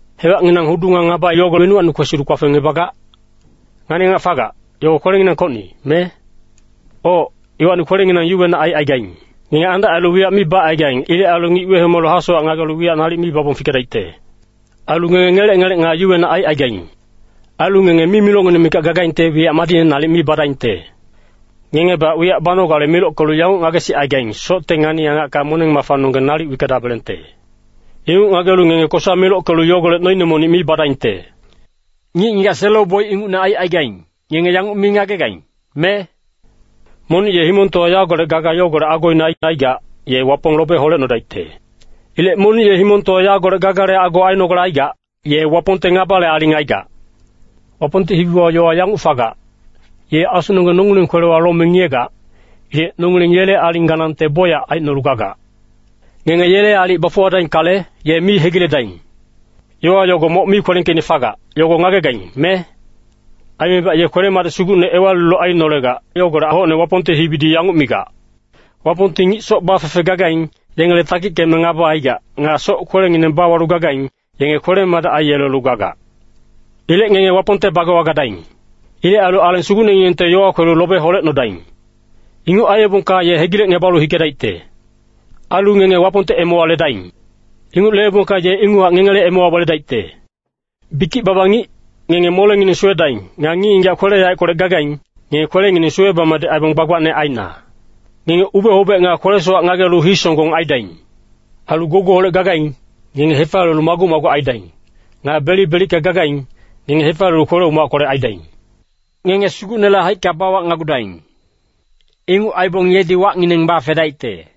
Hewacnginang hudu nga ngaba yogo wenuwacni kwesilu kpafengngebagac? Ngani-angac fagac, yogo kwelenginangkocni, me? Oc, iwacni kwelenginang yuwenac aicaigaing. Ngenge andac ailu wiyac mi bacaigaing. Ilec ailu ngic wehomalu hasowac ngagelu wiyac nalic mi babong fikedaicte. Ailu ngenge ngelec-ngelec nga yuwenac aicaigaing. Ailu ngenge mimilocngineng mikac gagaingte wiyac madicne nalic mi badaingte. Ngengebac wiyac banogale milockelu yanguc ngagesicaigaing, Socte ngani-angacka moneng-mafanonggeng nalic wickedabelengte. Inguc ngagelu ngenge kosa milockelu yogolec noine monic mi badaingte. Ngic-ngigac selo-boic ingucne aicaigaing, ngenge yanguc mi ngagegaing, me? Monic ye himongtowa yagolec gaga yogolec agoine aicaigac, ye Wapong lobe holecnodaicte. Ilec monic ye himongtowa yagolec gagale ago ainogale aigac, ye Wapongte ngabale aling aigac. Wapongte hibiwa yowa yanguc fagac, Ye asunonggeng nongileng kwelewa lome ngiyegac. Ilec nongileng yele aling ganangte bocyac aicnolu gagac. Ngenge yele aalic bafuwadaingkale, ye mi hegiledaing. Yowa yogo moc mi kwelengkeicne fagac, yogo ngagegaing, me? Aimebac ye kwele-madic sugucne ewalilu ainolegac, yogolec hocne Wapongte hibidi yanguc migac, “Wapongti ngic soc bafefe gagaing, yengele takickeme ngaba aigac. Nga soc-kwelengineng bawalu gagaing, yenge kwele-madic aiyelelu gagac.” Ilec ngenge Wapongte bagewa gadaing. Ilec ailu Aleng Sugucnenginengte yowa kwelu lobe holecnodaing. Inguc aiyebongka ye hegilecngebalu hikedaicte. Ailu ngenge Wapongte emewa ledaing. Inguc leebongka ye inguchac ngengele emewa weledaicte. Bikic-baba ngic, ngenge molengineng suwedaing. Nga ngic-ngigac kwele-yaeckolec gagaing, ngenge kwelengineng suwe-bamadic aibong gbagbacne aina. Ngenge ube-hobec nga kwele-sowac ngagelu hii-songgong aidaing. Ailu gougouholec gagaing, ngenge hefaliyelu maguc-maguc aidaing. Nga belic-belicka gagaing, ngenge hefaliyelu kwele-umackolec aidaing. Ngenge Sugucnele haicka bawacnagudaing. Inguc aibong yedi wacngineng bafedaicte.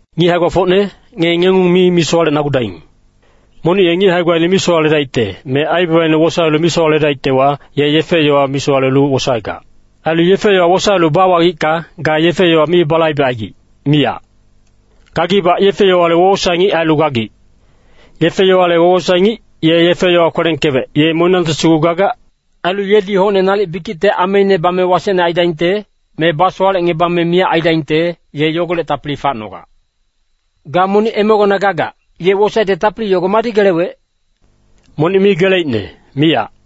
Ngic hae-gbafocne, ngenge ngengung mi misowalecnagudaing. Monic ye ngic hae-gbaine misowaledaicte, me aibabaine wosaelu misowaledaictewa, ye yefe-yowa misowalelu wosaegac. Ailu yefe-yowa wosaelu bawagicka, ga yefe-yowa mi balaibecaigic, miyac. Gagibac yefe-yowale wowosae-ngic ailu gagic. Yefe-yowale wowosae-ngic, ye yefe-yowa kwelengkewec, ye moniyangti sugu gagac. Ailu yedi hocne nalic bikicte ameine bame wasecne aidaingte, me basowalecngebame miyac aidaingte, ye yogolec tapili facnogac. Ga monic emegona gagac, ye wosaecte tapili yogo madi gelewec? Monic mi geleicne, miyac.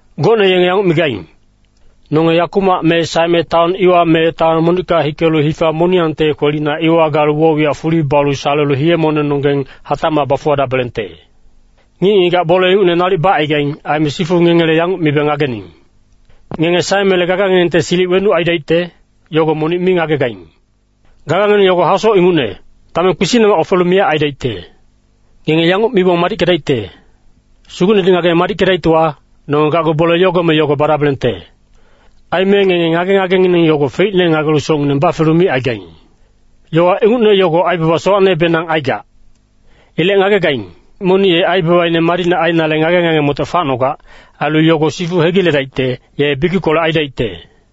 Gocne yenge yanguc migaing, “Nonge yakumac me saeme taon iwa me taon monicka hikelu hifa moniyangte kwelina iwa galu woc-wiyac fuli balu salelu hiye-monengnonggeng hatacmac bafuwadabelengte.” Ngic-ngigac bole ingucne nalic bacaigaing. Aime sifu ngengele yanguc mibe ngagening. “Ngenge saemele gaganginengte silic wenuc aidaicte, yogo monic mi ngagegaing. Gagangineng yogo hasoc ingucne, dameng kpisicnemac ofelu miyac aidaicte.” Ngenge yanguc mibong madickedaicte, “Sugucnedi ngageme madickedaictewa, nonge gacgu bole yogo me yogo badabelengte.” Aime ngenge ngage-ngagengineng yogo feicne ngagelu socngineng bafelu micaigaing. Yowa ingucne yogo aibaba sowacnebenang aigac. Ilec ngagegaing, monic ye aibabaine madicne ainale ngage-ngage-motoc facnogac. Ailu yogo sifu hegiledaicte, ye bikickolec aidaicte.